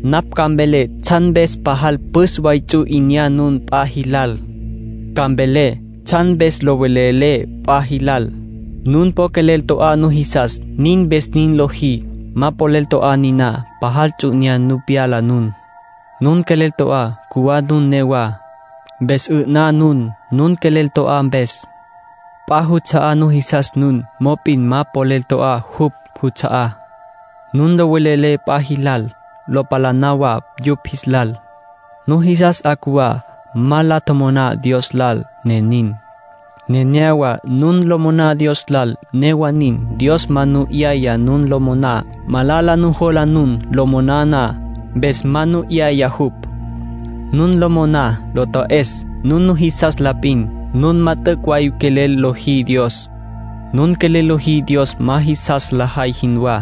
Napj ca mvelé tsjan mpes pajal püs way ts'u 'inyá nun p'a jilal. Ca mvelé tsjan mpes lo velelé p'a jilal. Nun po quelel to'á nujisas, nin mpes nin lojí. Ma polel to'á niná, pajal ts'u 'inyá nu pyala nun. Nun quelel to'á, cjuwá nun newá. Mpes 'ü'ná nun, nun quelel to'á mpes. P'a juts'a'á nujisas nun, mop'in ma polel to'á jupj juts'a'á. Nun lo velelé p'a jilal, lo palaná wa yupj jis lal. Nujisas 'a cjuwá. Ma la tjomoná Dios lal, ne nin. Nenéyawa nun lo moná Dios lal; newa nin, Dios ma nu 'yaya nun lo moná. Malala nujola nun lo moná na, mpes ma nu 'yaya jupj. Nun lo moná lo ta'es nun nujisas la p'in. Nun ma t'üc' way quelel lojí Dios. Nun quelel lojí Dios ma jisas lajay jinwá.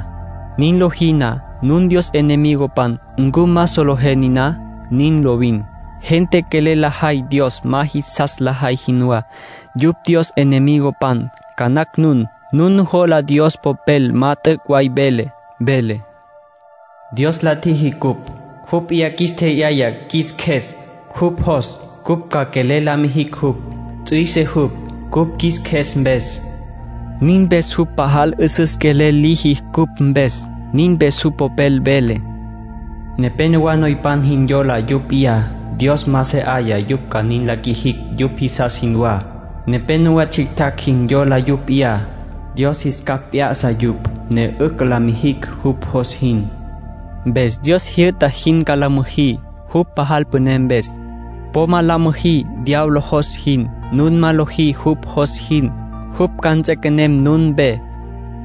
Nin lojí na, nun Dios enemigopan. ¿Ncu ma solejé niná? Nin lovin. Gente quelel lajay Dios ma jisas lajay jinwá, yupj Dios enemigopan. Ca nacj nun nujola Dios Popel ma t'üc' way vele. Vele: “Dios la tjiji cupj. Jupj p'iyá qjuis tje'yaya qjuis qjues. Jupj jos cupj ca quelel la mijicj jupj. Ts'üise jupj cupj qjuis qjues mpes.” Nin mpes jupj pajal 'üsüs quelel liji cupj mpes. Nin mpes jupj Popel vele: “Nepénowa noypan jin yola yupj p'iyá. Dios ma se 'aya yupj ca nin la qjuijicj yupj jisas jinwá. Nepénowa tsjictjacj jin yola yupj p'iyá. Dios jis capj p'ya'sa yupj, ne 'ücj ca la mijicj jupj jos jin.” Mpes Dios jyü'ta jin ca la müjí, jupj pajal püné mpes. Po ma la müjí diablo jos jin. Nun ma lojí jupj jos jin, jupj ca nts'equenem nun mpe.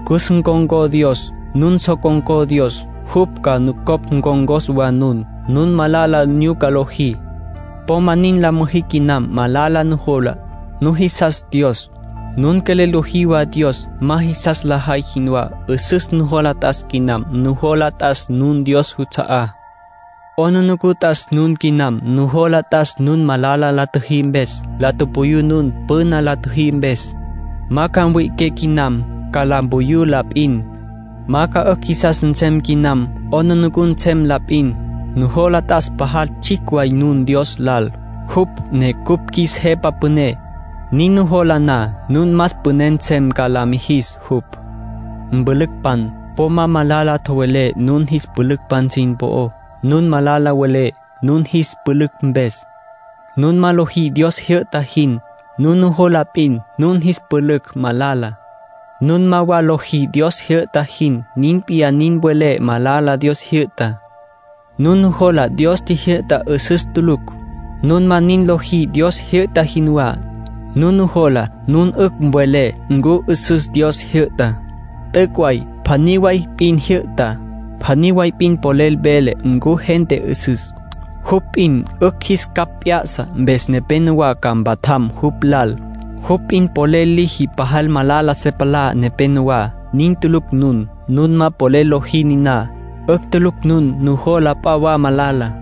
Cus ncon̈có Dios. Nun so con̈có Dios, jupj ca nucopj ncon̈cos wa nun. Nun malala nyuca lojí. Po ma nin la müjí quinam. Malala nujola. Nujisas Dios; nun quelel lojí wa Dios ma jisas lajay jinwá. 'Üsüs nujola t'as quinam. Nujola t'as nun Dios juts'a'á. 'Aplijila t'as nun quinam. Nujola t'as nun malala la tjüjí mpes. La tupuyú nun püna la tjüjí mpes. Ma ca mwi'iqué quinam; ca la mpuyú la p'in. Ma ca 'ücj jisas nsem quinam; 'aplijila nsem la p'in. Nujola t'as pajal tsjicj way nun Dios lal, jupj ne cupj qjuis Jepa Püné. Nin nujola na, nun más püné nsem ca la mijis jupj. Mpülücpan, po ma malala tjowelé nun jis pülücpan sin po'ó. Nun malala welé nun jis pülücj mpes, nun ma lojí Dios jyü'ta jin. Nun nujola p'in nun jis pülücj malala, nun ma wa lojí Dios jyü'ta jin. Nin p'iyá nin welé malala Dios tjijyü'tá. Nun nujola Dios tjijyü'tá 'üsüs tulucj, nun ma nin lojí Dios jyü'ta jinwá. Nun nujola nun 'ücj welé ncu 'üsüs Dios tjijyü'tá. T'üc' way pjaní way p'in jyü'ta. Pjaní way p'in polel vele ncu gente 'üsüs. Jupj p'in 'ücj jis capj p'ya'sa, mpes nepénowa ca mpatjam jupj lal. Jupj p'in polel liji pajal malala se palá nepenowá. Nin tulucj nun. Nun ma polel lojí niná. 'Ücj tulucj nun nujola p'a wa malala.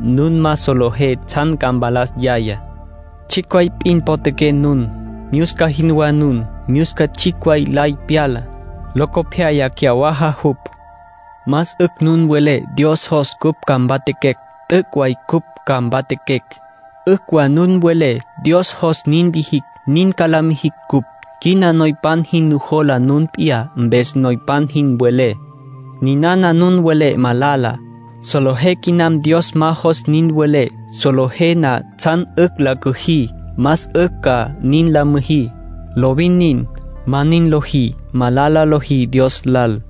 nun ma solejé tsjan ca mpalas yayá. Tsjicj way p'in potjaqué nun. Myusca jinwá nun. Myusca tsjicj way lay pyala, locopyaya cyawaja jupj. Más 'ücj nun welé: “Dios jos cupj ca mpatjaquecj, t'üc' way cupj ca mpatjaquecj”. 'Ücj wa nun welé: “Dios jos nin lijicj, nin ca la mijicj cupj”. Quina noypan jin nujola nun p'iyá, mpes noypan jin welé. Ninana nun welé, malala. Solejé quinam Dios ma jos nin welé. Solejé na tsjan 'ücj la cüjí, más 'ücj ca nin la müjí. Lovin nin. Ma nin lojí, malala lojí Dios lal.